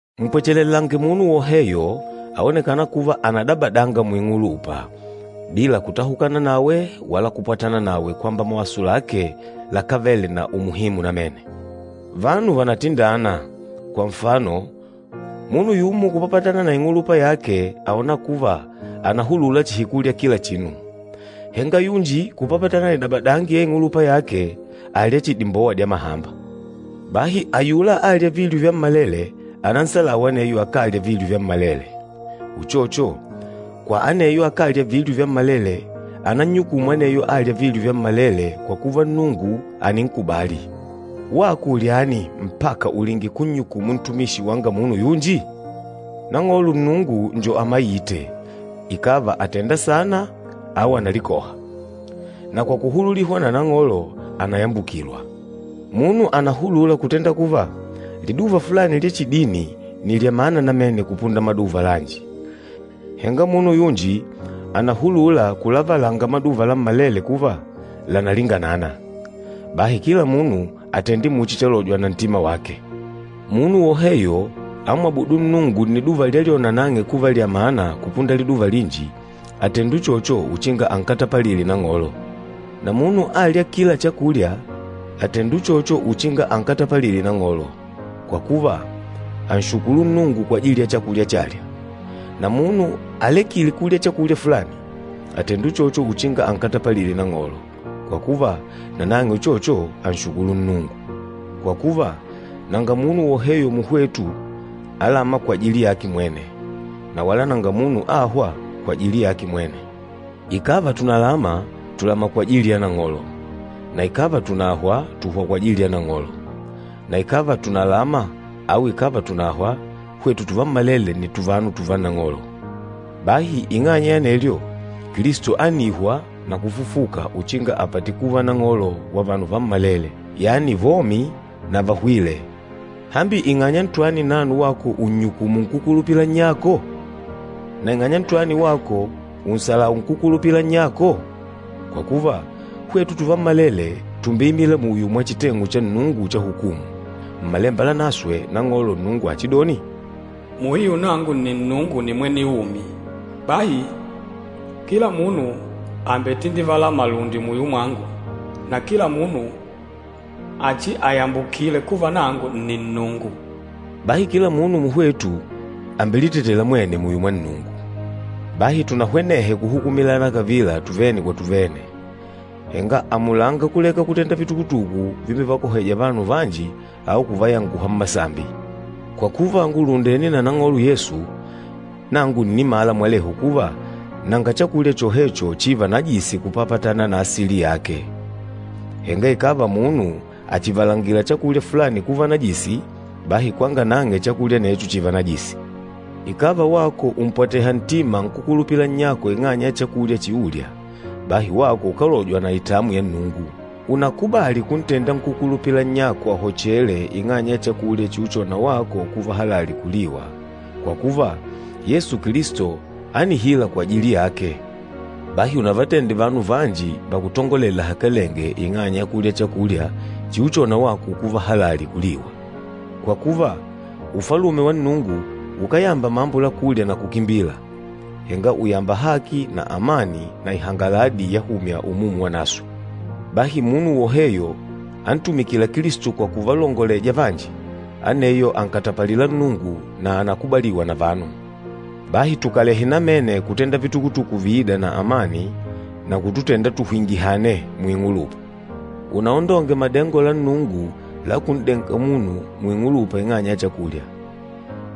Mpwechelelange munu woheyo aonekâna kuva ànadabadanga muing'ulupa, bila kutahukana nawe wala kupwatana nawe kwamba mawaso lake lakávele na umuhimu namene. Vanu vànatindana, kwa nfano munu yumo kupapatana na ing'ulupa yake àona kuva ànahululula chihi kulya kila chinu, henga yunji kupapatana na idabadangi ya ing'ulupa yake àlya chihi dimbowa dya mahamba. Bahi ayula âlya vilyo vyammalele ananhebule aneyo akálya vilyo vyammalele. Uchocho, kwa aneyo akálya vilyo vyammalele ánannyukùmù aneyo âlya vilyo vyammalele kwa kuva Nnungu àninkubali. Wako ulyani mpaka ulinge kunnyukumu ntumishi wanga munu yunji? Nang'olo Nnungu njo amaîte, ikàva àtenda saana au ànalikoha. Na kwa kuhululihwa na Nang'olo, ànayambukilwa. Munu ànahulula kutenda kuva, liduva fulani lya chidini nni lya mana namene kupunda maduva lanji, henga munu yunji ànahulula kulavalanga maduva lammalele kuva lànalinganana. Bahi kila munu atende muchi chalojwa na ntima wake. Munu woheyo amwabûdu Nnungu nniduva lyalyona nang'e kuva lya mana kupunda liduva linji, àtenda uchocho uchinga ankatapalile Nang'olo. Na munu âlya kila chakulya, àtenda uchocho uchinga ankatapalile Nang'olo, kwa kuva, ànshukulu Nnungu kwajili ya chakulya chalya. Na munu alekîle kulya chakulya fulani, àtenda uchocho uchinga ankatapalile Nang'olo, kwa kuva nanang'e uchocho ànshukulu Nnungu. Kwa kuva, nanga munu woheyo muhwetu alâma kwajili yake mwene, na wala nanga munu âhwa kwajili yake mwene. Ikàva tùnalama, tùlama kwajili ya Nang'olo, na ikàva tùnahwa, tùhwa kwajili ya Nang'olo. Na ikàva tùnalama au ikàva tùnahwa, hwetu tuvammalele nni tuvanu tùvá Nang'olo. Bahi ing'anya ya anelyo, Kilisto ánihwa na kufufuka uchinga apate kuva Nang'olo wa vanu vammalele, yani vomi na vahwîle. Hambi ing'anya ntwani nano wako ùnnyukumu nkúkulupila nnyako? Na ing'anya ntwani wako ùnhebula nkúkulupila nnyako? Kwa kuva, hwetu tuvammalele tùmbeimila muyo mwa chiteng'u cha Nnungu cha hukumu. Mmalemba Lanaswe, Nang'olo Nnungu achidoni, “Muhiu Nangu nni Nnungu nimwene umi, bahi, kila munu àmbetindivala malundi muyo mwangu, na kila munu achiayambukile kuva nangu nni Nnungu.” Bahi kila munu muhwetu àmbelitetela mwene muyo mwa Nnungu. Bahi tunahwenehe kuhukumilana kavila tuvene kwa tuvene. Henga amulanga kuleka kutenda vitukutuku vimbevakohêja vanu vanji au kuvayanguha mmasambi. Kwa kuva ngùlundene na Nang'olo Yesu, nangu ǹnimala mwelehu kuva nanga chakulya chohecho chîva najisi kupapatana na asili yake. Henga ikàva munu àchivalangila chakulya fulani kuva najisi, bahi kwanga nang'e chakulya anecho chììva najisi. Ikàva wako ùmpwateha ntima nkúkulupila nnyako ing'anya ya chakulya chiulya, bahi wako ukálojwa na itamwi ya Nnungu. Únakubàlì kuntenda nkúkulupila nnyako ahochele ing'anya ya chakulya chiuchona wako kuva halali kuliwa, kwa kuva Yesu Kilisto ánihila kwajili yake. Bahi unavatende vanu vanji vakutongolele lahakalenge ing'anya ya kulya chakulya chiuchona wako kuva halali kuliwa. Kwa kuva, Ufalume wa Nnungu ukáyamba mambo la kulya na kukimbila, henga ùyamba haki na amani na ihangaladi yahumya Umumu Wanaswe. Bahi munu woheyo antumikîla Kilisto kwa kuvalongoleja vanji, aneyo ànkatapalila Nnungu na ànakubaliwa na vanu. Bahi tukalehe namene kutenda vitukutuku viîda na amani na kututenda tuhwingihane muing'ulupa. Unaondonge madengo la Nnungu la kun'denga munu muing'ulupa ing'anya ya chakulya.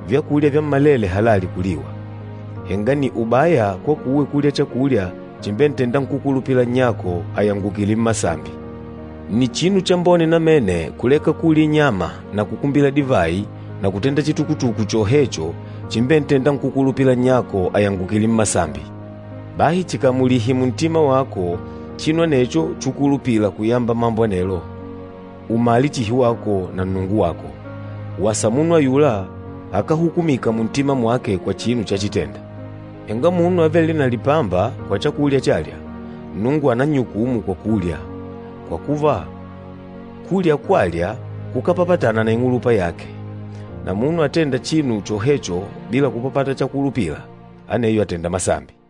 Vyakulya vyammalele halali kuliwa, henga nni ubaya kwakuwe kulya chakulya chimbentênda nkúkulupila nnyako ayangukile mmasambi. Nni chinu chambone namene kuleka kulya inyama na kukumbila divayi na kutenda chitukutuku chohecho chimbentênda nkúkulupila nnyako ayangukile mmasambi. Bahi chikamulihe muntima wako chinu anecho chukulupila kuyamba mambo anelo, umale chihi wako na Nnungu wako. Wasa munu ayula akáhukumika muntima mwake kwa chinu chachitenda. Henga munu avêle na lipamba kwa chakulya chalya, Nnungu ànannyukumu kwa kulya, kwa kuva kulya kwalya kukápapatana na ing'ulupa yake. Na munu atênda chinu chohecho bila kupapata chakulupila, aneyo àtenda masambi.